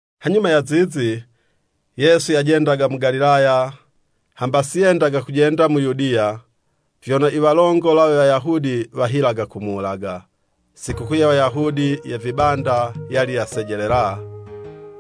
Hanyuma ya zizi, Yesu yajendaga mu Galilaya, hamba si yendaga kujenda mu Yudiya, vyono i walongola we Wayahudi wahilaga kumuwulaga. Sikukuu ye Wayahudi ye vibanda, yali yasejelela.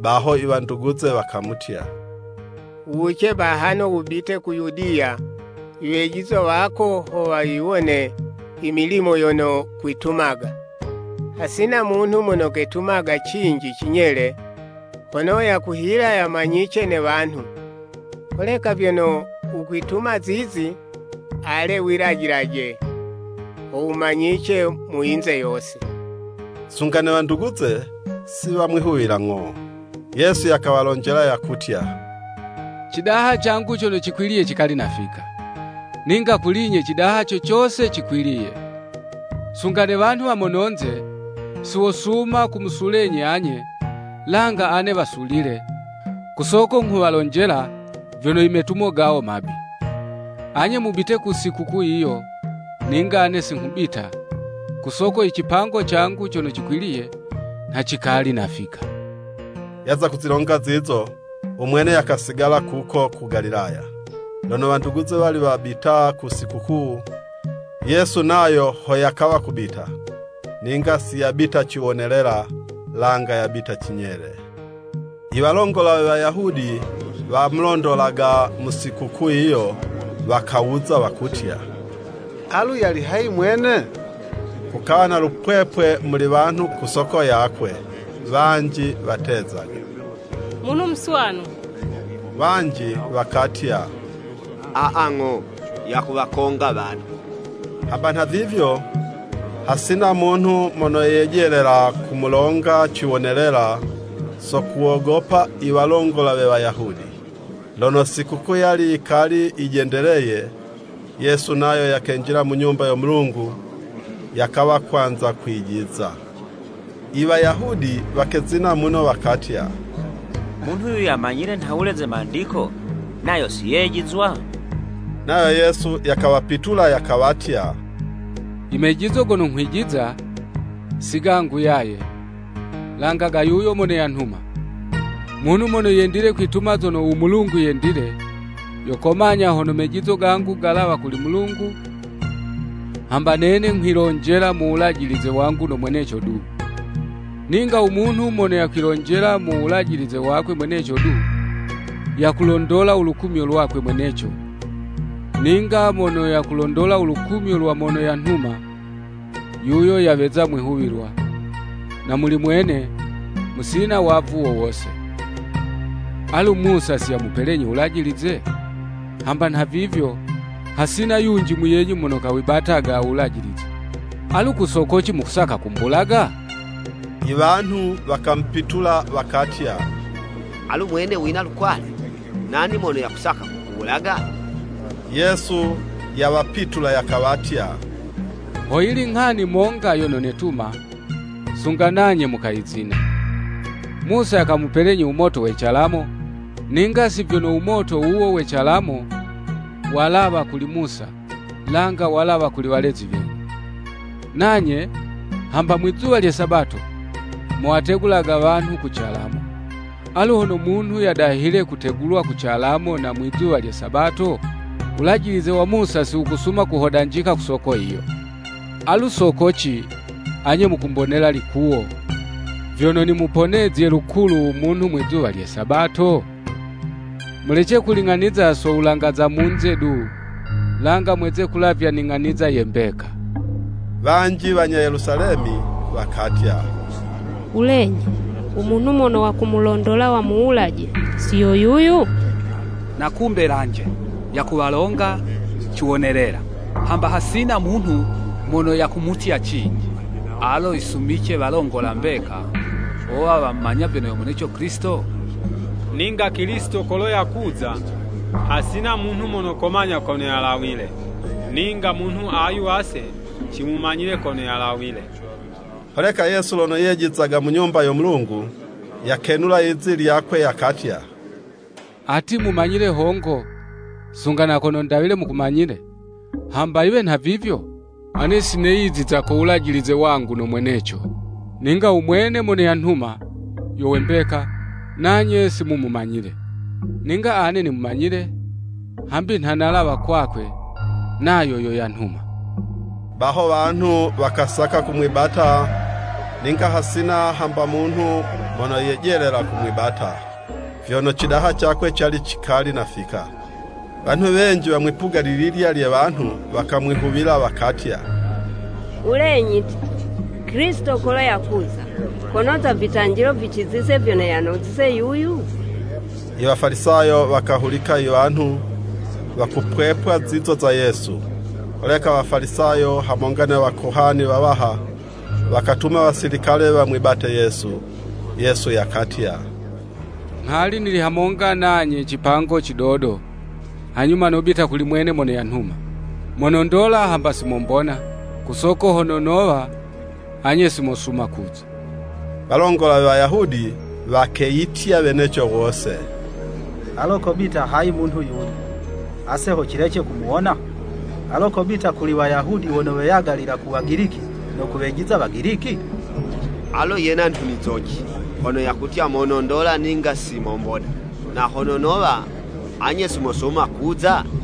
Baho i wanduguze wakamutya, “Wuwuce bahano wubite ku Yudiya, iwejizwa wako ho wayiwone i milimo yono kwitumaga. Hasina munhu mono ketumaga cinji cinyele, hono yakuhila yamanyice ne wanhu. Holeka vyono wukwituma zizi, ale wilajilaje ho wumanyice mu yinze yose.” ( Sunga ne wanduguze, si wamwihuwila ng'o.) Yesu yakawalonjela yakutya, “Cidaha cangu cono cikwiliye cikali nafika. Ninga kuli 'nye cidaha co cose cikwiliye. Sunga ne wanhu wa mononze, si wosuma kumusulenyi anye, langa ane wasulile, ku soko nghuwalonjela, vyono i metumo gawo mabi. Anye mubite ku sikukuu yiyo, ninga ane si nghubita, kusoko i cipango cangu cono cikwiliye, nha cikali nafika.” Yaza kuzilonga zizo, u mwene yakasigala kuko ku Galilaya. Lono wanduguze wali wabita ku sikukuu, Yesu nayo ho yakawa kubita, ninga siyabita ciwonelela, langa yabita cinyele. I Walongola we Wayahudi wamulondolaga mu sikukuu yiyo, wakawuza wakutya, “Alu yali hayi mwene?” Kukawa na lupwepwe muli wanhu ku soko yakwe, wanji watezaga, “Munhu muswanu.” Wanji wakatya, “Aa, ng'o, yakuwakonga wanhu.” Hamba nhavivyo, hasina munhu mono yejelela kumulonga ciwonelela so kuwogopa i walongola we Wayahudi. Lono sikukuu yali yikali yijendeleye, Yesu nayo yakenjila mu Nyumba yo Mulungu, yakawa kwanza kwijiza. I Wayahudi wakezina muno, wakatya, “Munhu yuyu yamanyile nhawule ze mandiko, nayo si yejizwa?” Nayo Yesu yakawapitula, yakawatya, “Imejizo gono nghwijiza, si gangu yaye, langa ga yuyo mono yanhuma. Munhu mono yendile kwituma zono u Mulungu yendile, yo komanya hono mejizo gangu galawa kuli Mulungu, hamba nene nghwilonjela mu wulajilize wangu no mweneco du. Ninga u munhu mono yakwilonjela mu wulajilize wakwe mweneco du, yakulondola u lukumyo lwakwe mweneco, ninga mono yakulondola u lukumyo lwa mono yamutuma, yuyo yaweza mwihuwilwa, na muli mwene musina wavu wo wose. Alu Musa si yamupelenyi Wulajilize? Hamba nhavivyo, hasina yunji muyenyu mono kawibataga u Wulajilize. Alu ku sokoci mukusaka kumbulaga?” Iwanhu wakamupitula wakatya, “Alu mwene wina lukwale! Nani mono yakusaka kukuwulaga?” Yesu yawapitula, yakawatya, “Hoyili nghani monga yono netuma, sunga nanye mukayizina. Musa yakamupelenyi u moto we calamo, ninga si vyono u moto wuwo we calamo walawa kuli Musa, langa walawa kuli walezi wenyu. Nanye, hamba mwizuwa lye Sabato, muwategulaga wanhu ku calamo. Alu hono munhu yadahile kutegulwa ku calamo na mwizuwa lye Sabato, Wulajilize wa Musa si wukusuma kuhodanjika, ku soko yiyo, alu sokoci, anye mukumbonela likuwo, vyono nimuponezye lukulu u munhu mwizuwa lye Sabato? Mulece kuling'aniza so wulanga za munze du, langa mweze kulavya ning'aniza ye mbeka.” Wanji wanya Yelusalemi wakatya, “Wulenyi, u munhu mono wakumulondola wamuwulaje, si yo yuyu? Na kumbe lanje, yakuwalonga ciwonelela, hamba hasina munhu mono yakumutya cinji. Alo yisumice walongola mbeka, wowa wamumanya vyono yo mweneco Kilisito Ninga Kilisito kolo yakuza, hasina munhu mono komanya kono yalawile, ninga munhu ayu ase cimumanyile kono yalawile!” Holeka Yesu lono yejizaga mu Nyumba yo Mulungu, yakenula lizi lyakwe, yakatya, “Ati, mumanyile hongo, sunga na kono ndawile mukumanyile! Hamba yiwe nhavivyo, ane si neyiziza ko wulajilize wangu no mweneco, ninga u mwene mono yanhuma yo we mbeka, nanye si mumumanyile. Ninga ane nimumanyile, hambi nha nalawa kwakwe, nayo yo yanhuma.” Baho wanhu wakasaka kumwibata, ninga hasina hamba munhu mono yejelela kumwibata, vyono cidaha cakwe cali cikali nafika. Wanhu wenji wa mwipuga lililya lye wanhu wakamwihuwila, wakatya, “Wulenyi ti, Kilisito kolo yakuza, konoza vitanjilo vicizize vyono yanozize yuyu?” Iwafalisayo wakahulika iwanhu wakupwepwa zizo za Yesu. Holeka Wafalisayo, hamonga ne wakohani wawaha, wakatuma wasilikale wamwibate Yesu. Yesu yakatya, “Nghali nili hamonga nanye cipango cidodo, hanyuma nobita kuli mwene mono yanhuma. Monondola hamba si mombona, ku soko hono nowa, anye simosuma kuza.” Walongola we Wayahudi wakeyitya weneco wose, “Alo kobita hayi munhu yuyu, ase ho cilece kumuwona?” Alo kobita kuli Wayahudi wono weyagalila ku Wagiliki, no kuwejiza Wagiliki? Alo yena nhunizo ci, hono yakutya, “Monondola ninga si mombona, na hono nowa, anye si mosuma kuza?”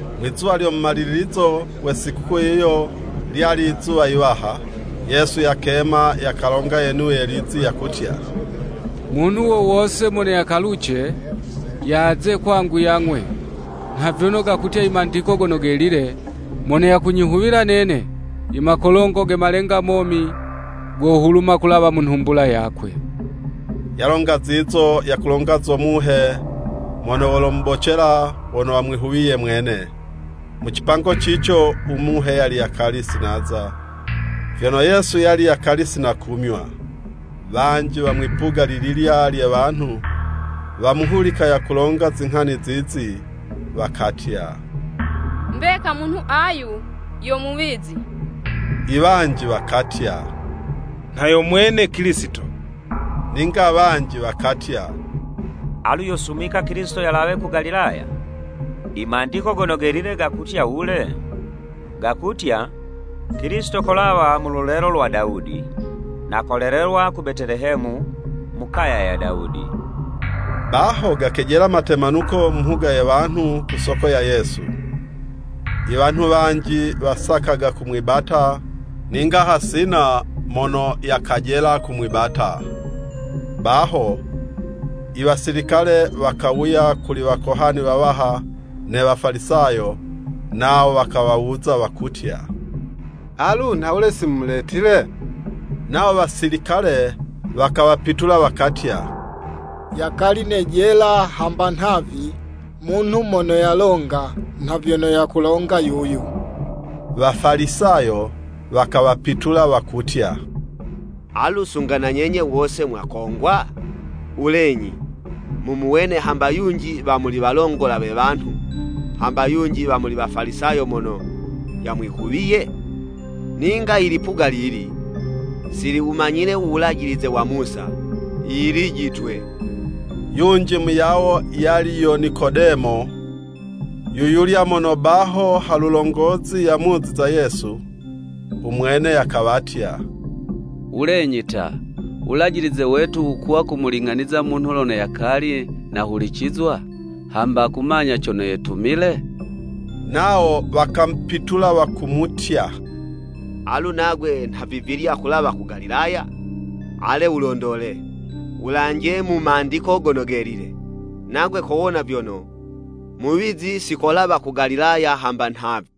Mwi'zuwa lyo mumalilizo we sikukuu yiyo, lyali yizuwa yiwaha. Yesu yakema, yakalonga yenuye lizi, yakutya, “Munhu wo wose, mono yakaluce, yaze kwangu yang'we.” Nha vyono gakutya i Mandiko Gono Gelile, “Mono yakunyihuwila nene, i makolongo ge malenga momi, gohuluma kulawa mu nhumbula yakwe.” (Yalonga zizo, yakulonga zo Muhe Mono wolomubocela wono wamwihuwiye mwene. Mu cipango cico u Muhe yali yakali si naza, vyono Yesu yali yakali si nakumywa.) Wanji wa mwipuga lililya lye wanhu, wamuhulika yakulonga zinghani zizi, wakatya, “Mbeka munhu ayu yo muwizi.” Iwanji wakatya, “Nha yo mwene Kilisito.” Ninga wanji wakatya, “Alu yosumika Kilisito yalawe ku Galilaya?” I Mandiko Gono Gelile gakutya wule? Gakutya, “Kilisito kolawa mu lulelo lwa Dawudi, na kolelelwa ku Betelehemu, mu kaya ya Dawudi.” Baho gakejela matemanuko mu mhuga ye wanhu ku soko ya Yesu. Iwanhu wanji wasakaga kumwibata, ninga hasina mono yakajela kumwibata. Baho iwasilikale, wakawuya kuli wakohani wawaha ne Wafalisayo, nawo wakawawuza wakutya, “Alu nhawule si mumuletile?” Nawo Wasilikale wakawapitula wakatya, “Yakali nejela hamba nhavi, munhu mono yalonga, nha vyono yakulonga yuyu.” Wafalisayo wakawapitula wakutya, “Alu sunga na nyenye wose mwakongwa? Wulenyi, mumuwene hamba yunji wa muli walongola we wanhu, hamba yunji wa mu Wafalisayo mono yamwihuwiye? Ninga ilipuga lili, si liwumanyile u Wulajilize wa Musa, yilijitwe.” Yunji muyawo yali yo Nikodemo yuyulya mono baho halulongozi yamuziza Yesu. U mwene yakawatya, “Wulenyi ta, u Wulajilize wetu wukuwa kumuling'aniza munhu lono yakali nahulicizwa, hamba kumanya cono yetumile?” Nawo wakamupitula wakumutya, “Alu nagwe nhavivilya kulawa ku Galilaya? Ale wulondole, wulanje mu Mandiko Gono Gelile, nagwe kowona vyono, muwizi si kolawa ku Galilaya hamba nhavi.”